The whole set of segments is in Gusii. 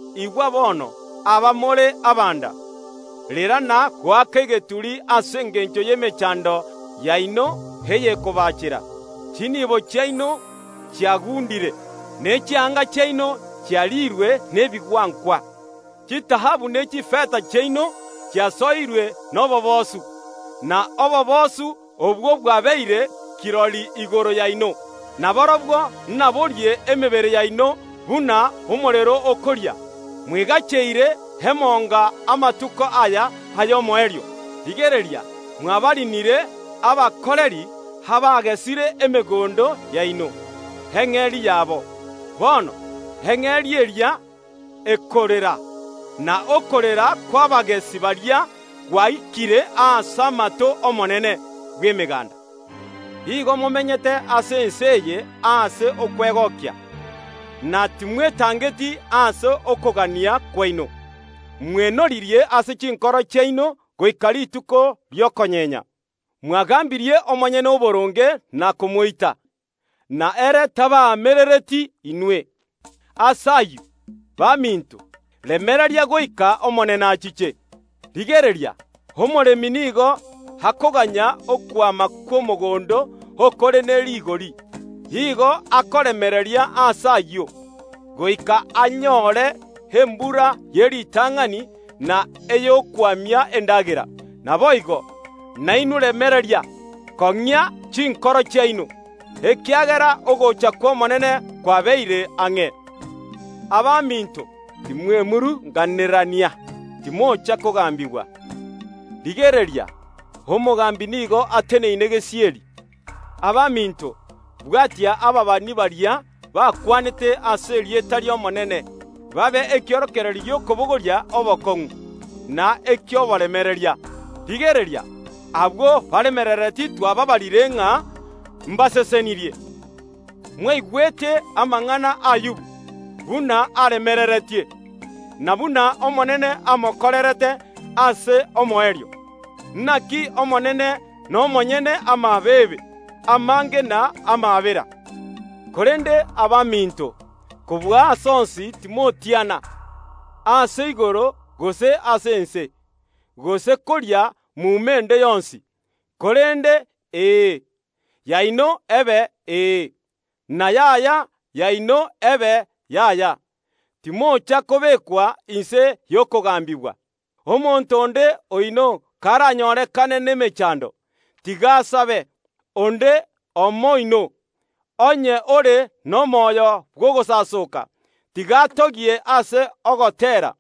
Igwa bono, abamore abanda, rera na goaka egeturi ase engencho y’emechando yaino eyekobacheera. Chinibo chiaino chiagundire, ne chianga chiaino chiarirwe nebigwankwa. Chitaabu ne chifeta chiaino chiasoirwe noboboosu, na oboboosu obwo bwabeire kirori igoro yaino, na borobwo naborie emebere yaino buna omorero okoria. Mwegacheire emonga amatuko aya ay’omoerio. Rigereria, mwabarinire abakoreri, abagesire emegondo yaino, eng’eria yabo. Bono eng’eria eria ekorera, na okorera kw’abagesi baria gwaikire ase amato ’Omonene bw’Emeganda. Igo momenyete ase ense eye ase okwegokia, na timwetangeti ase okogania kwaino. Mwenoririe ase chinkoro chiaino goika rituko ri’okonyenya. Mwagambirie omonyene oboronge na komoita, na ere tabaamerereti inwe. Ase ayio, baminto, remereria goika Omonene achiche. Rigereria, omoremi nigo akoganya okwama kw’omogondo okore ne rigori. Igo akoremereria ase ayio, goika anyore embura ye ritang’ani na ey’okwamia endagera. Naboigo, nainwe remereria, kong’ia chinkoro chiaino, ekiagera ogocha kw’Omonene kwabeire ang’e. Abaminto, timwemurunganerania, timocha kogambigwa. Rigereria, Omogambi nigo ateneine gesieri. Abaminto, bwatia ababani baria bakwanete ase erieta ri’Omonene, babe ekiorokererio gi’okobogoria obokong’u, na eki’oboremereria. Rigereria, abwo baremereretie twabaabarire ng’a mbasesenirie. Mwaigwete amang’ana ’Ayubu buna aremereretie, na buna Omonene amokorerete ase omoerio. Naki Omonene nomonyene amabeebe amange na amaabera. Korende abaminto, kobua ase onsi timotiana, ase igoro, gose ase ense, gose koria muma ende yonsi, korende “ee” yaino ebe “ee”, na “yaya” yaino ebe “yaya”, timocha kobekwa inse y’okogambigwa. Omonto onde oino karanyorekane nemechando, tiga asabe. Onde omo oino, onye ore nomoyo bw’ogosasoka, tiga atogie ase ogoteera.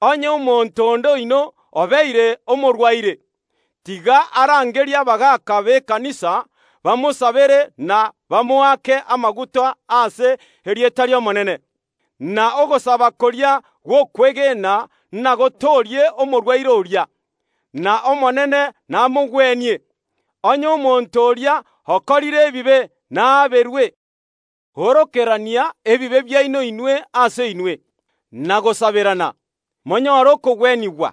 Onye omonto onde oino obeire omorwaire, tiga arangerie abagaaka b’ekanisa bamosabere na bamoake amaguta ase erieta ri’Omonene. Na ogosaba koria gw’okwegena nagotoorie omorwaire oria, n’Omonene namogwenie. Onye omonto oria okorire ebibe naaberwe. Orokerania ebibe biaino inwe ase inwe, na gosaberana, monyore okogwenigwa.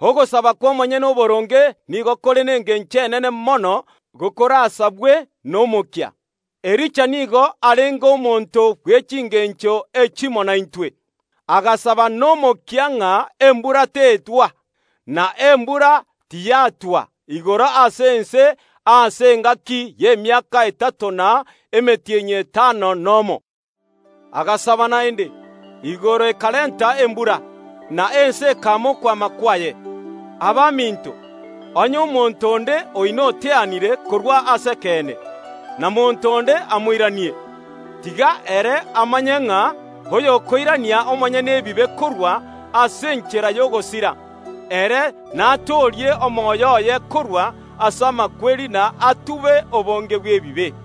Ogosaba kw’omonyene oboronge nigo kore nengencho enene mono gokorasabwe nomokia. Elija nigo arenge omonto bwe chingencho echimo naintwe, agasaba nomokia ng’a embura tetwa. Na embura tiyatwa igoro ase ense ase engaki y’emiaka etato na emetienyi etano nomo. Agasaba naende, igoro ekarenta embura, na ense ekama okwama kwaye. Abaminto, onye omonto onde oino oteanire korwa ase ekeene, na monto onde amoiranie, tiga ere amanye ng’a oyokoirania omonyene ebibe korwa ase enchera y’ogosira, ere natoorie omoyo oye korwa ase amakweri na atube obonge bw’ebibe.